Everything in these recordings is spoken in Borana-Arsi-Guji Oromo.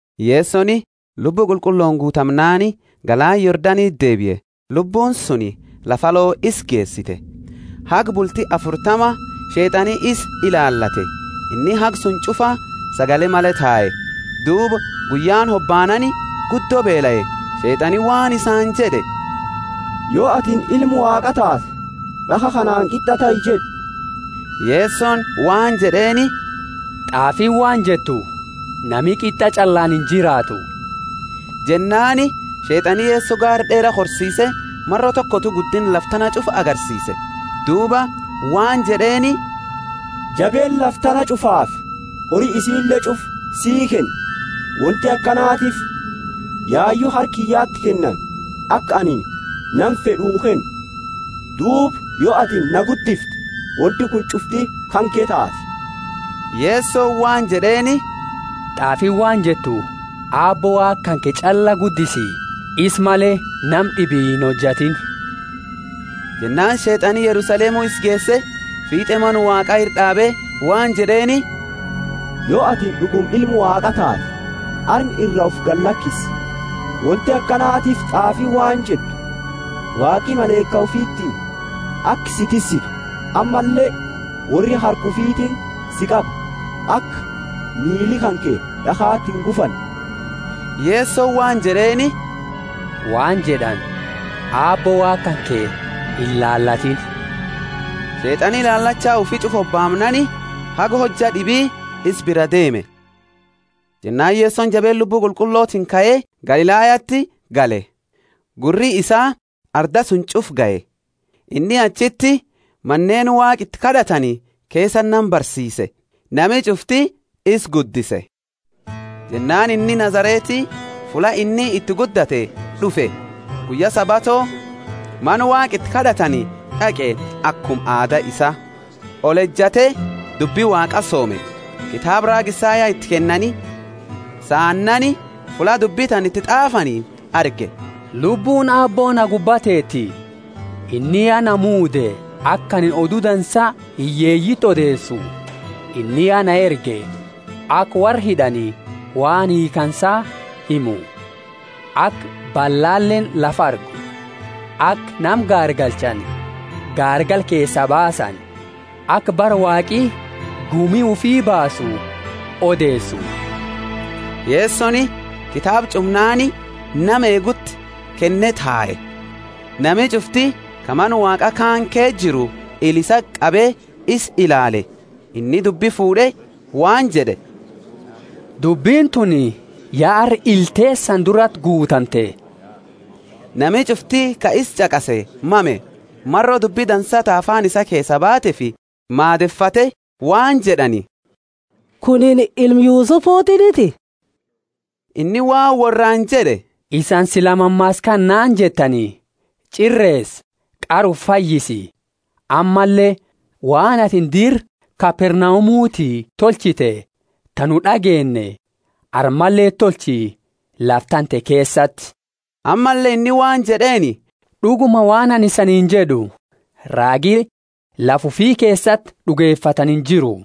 Yesoni, Lubbu Qulqullooni guutamnaani galaana Yordaniti deebie; Lubbuuni suni lafa alo isa geesite. Haga bulti afurtama Sheet'ani isa ilaalate, inni haga suni ch'ufa sagale male tae. Duuba guyyaani hobaanaani guddo beelae. Sheet'ani waan isaani jed'e, Yo atini Ilma Waaqaa taate, d'akha kanaani, Qit'a tahi jed'i. Yesoni waan jed'eeni, T'aafiini waan jettu, Nami qit'a ch'allaani injiraatu. Jennaani Sheet'ani Yeso gaara d'eera korsiise maro tokotu guddinna lafa tana ch'ufa agarsiise. Duuba waan jed'eeni jabeenna lafa tana ch'ufaafi hori isiile ch'ufa sii kenna, wonti akanatiifi yayu harka kiyyati kennani aka anini nama fed'u kennu. Duuba yo ati na guddifte wonti kuni ch'ufti kanke taati. Yesoni waan jed'eeni, T'aafiini waan jettu Aabbo Waaqa kanke ch'alla guddisi, isa male nama d'ibi inhojatiini. Jennaani Sheet'ani Yerusalemu isa geese, fiit'e Mana Waaqa ira d'aabe waan jed'eeni, Yo atini d'uguma Ilma Waaqa taate, arma iraa ufi gadi lakisi. Wonti akanatiifi t'aafiini waan jettu, Waaqi malaika ufiti hima, aka si tissitu. Ammalle, worri Harka ufitiini si qaba aka miili kanke d'akhati ingufanne. Yesoni waan jed'eeni, Waan jed'ani, Aabbo Waaqa kanke inilaalatiini. Sheet'ani ilaalacha ufi ch'ufa hobaamnaani haga hojja d'ibi isa biraa deeme. Jennaani Yesoni jabeenna Lubbu Qulqullotiini kae Galilayati gale; gurri isaa arda suni ch'ufaa gahe. Inni achiti maneeni Waaqa iti kad'atani keesati nama barsiise; nami ch'ufti isa guddise. Jennaani inni Nazareti fulla inni iti guddate d'ufe, guyya Sabato Mana Waaqa iti kad'atani d'aqe akuma aada isaa, olejate dubbi Waaqaa soome. Kitaaba raaga Isaya iti kennani, saannaani fulla dubbi tana iti t'aafani arge: Lubbuuni Aabbo na gubba teeti. Inni ya na muude aka anini odu dansa hiyyeeyiti odeesu. Inni ya na erge aka worra hid'ani waan hiikhaansa himu, aka ballaleeni lafa argu, aka nama gaargalchani gaargala keesaa baasani, aka bara Waaqi gumi ufi baasu odeesu. Yesoni kitaaba ch'umnaani nama eeguti kenne tae. Nami ch'ufti ka Mana Waaqa kaani keesa jiru ila isati qabe isa ilaale. Inni dubbi fuud'e waan jed'e, Dubbini tuni ya arra ila teesani durati guutamte. Nami ch'ufti ka isa ch'aqase mame, maro dubbi dansa ta afaani isaa keesaa baateefi maadefate, waan jed'ani, Kunini ilma Yusufutiniti? Inni waan worraani jed'e, Isani sila mammaasa kana naani jettani, Ch'ireesa, qara ufi fayyisi. Ammalle, waan atini dira Kapernaumuti tolchite ta nu d'ageenne, armaleti tolchi, lafa tante keesati. Ammalle inni waan jed'eeni, D'uguma waan anini isaniini jed'u, Raagi lafa ufi keesati d'ugefatani injiru.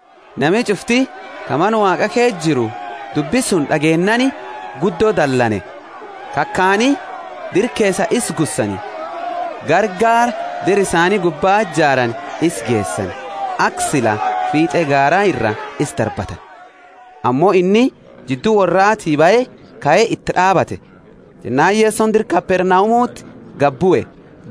Nami ch'ufti ka mana Waaqa keesa jiru dubbi suni d'ageennaani guddo dalane. Kakaani dira keesaa isa gussani, gara gaara dira isaani gubba jaarani isa geesani, aka sila fiit'e gaara iraa isa darbatani. Ammo inni jiddu worraati bahe kae iti d'aabate. Jennaani Yesoni dira Kapernaumuti gadi bue,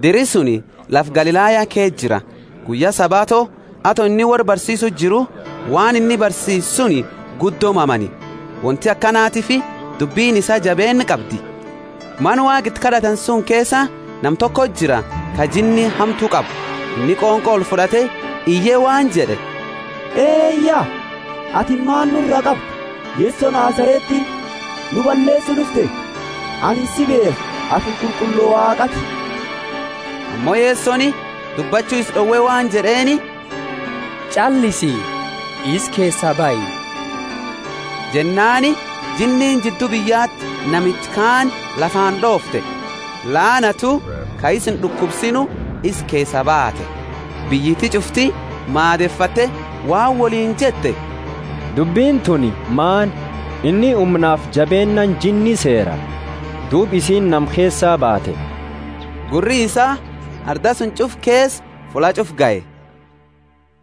diri suni lafa Galilaya ke jira; guyya Sabato, ato inni worra barsiisuu jiru, waan inni barsiise suni guddo mamani, wonti akanatiifi dubbini isaa jabeenna qabdi. Mana Waaqa iti kad'atani suni keesa nama tokoti jira ka jinni hamtu qabu; inni qonqo olfud'ate iye waan jed'e, Eya, atini maani nura qabda Yeso Nazareti? Nu balleesu d'ufte? Anini si beekha; atini Qulqullo Waaqaati. Ammo Yesoni dubbachu isa d'owe waan jed'eeni, Ch'allisi, isa keesaa bahi. Jennaani jinniini jiddu biyyati namicha kaani lafaani d'oofte, laanatu, ka isa ind'ukubsiinu, isa keesaa baate. Biyyiti ch'ufti maadefate waan woliini jette, Dubbini tuni maani? Inni humnafi jabeennaani jinni seera, duuba isiini nama keesaa baate. Gurri isaa arda suni ch'ufa keesa fulla ch'ufa gahe.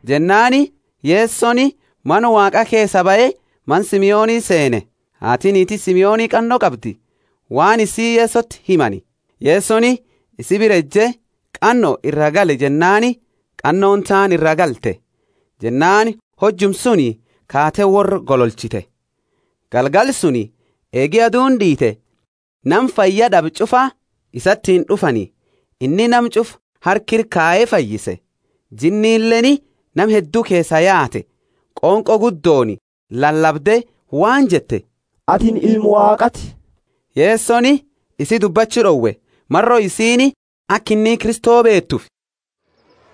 Jennaani Yesoni Mana Waaqa keesaa bahe mana Simoni seene. Haati niiti Simoni qanno qabdi, waan isii Yesoti himani. Yesoni isi bira eje, Qanno iraa gali jennaani, qannooni taani iraa galte; jennaani hojuma suni kaate worra gololchite. Galgala suni eegi aduuni d'iite, nama fayyad'abe ch'ufa isaatiini d'ufani. Inni nama ch'ufa harka ira kaye fayyise. Jinnileeni nama heddu keesaa yaate, qonqo guddooni lalabde waan jette, Atini Ilma Waaqaati. Yesoni isi dubbachu d'owe, maro isiini aka inni Kristo beetuufi.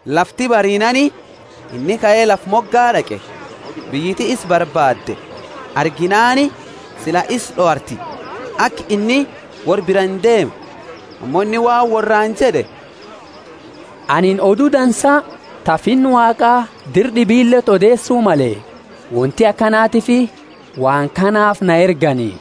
Lafti bariinaani inni kae lafa moga d'aqe. Biyyiti isa barbaadde, arginaani sila isa d'owarti, aka inni worra biraa indeemne. Ammo inni waan worraani jed'e, Anini Odu Dansa ta Finna Waaqa dira d'ibileti odeesu male; wonti akanatiifi waan kanaafi na ergani.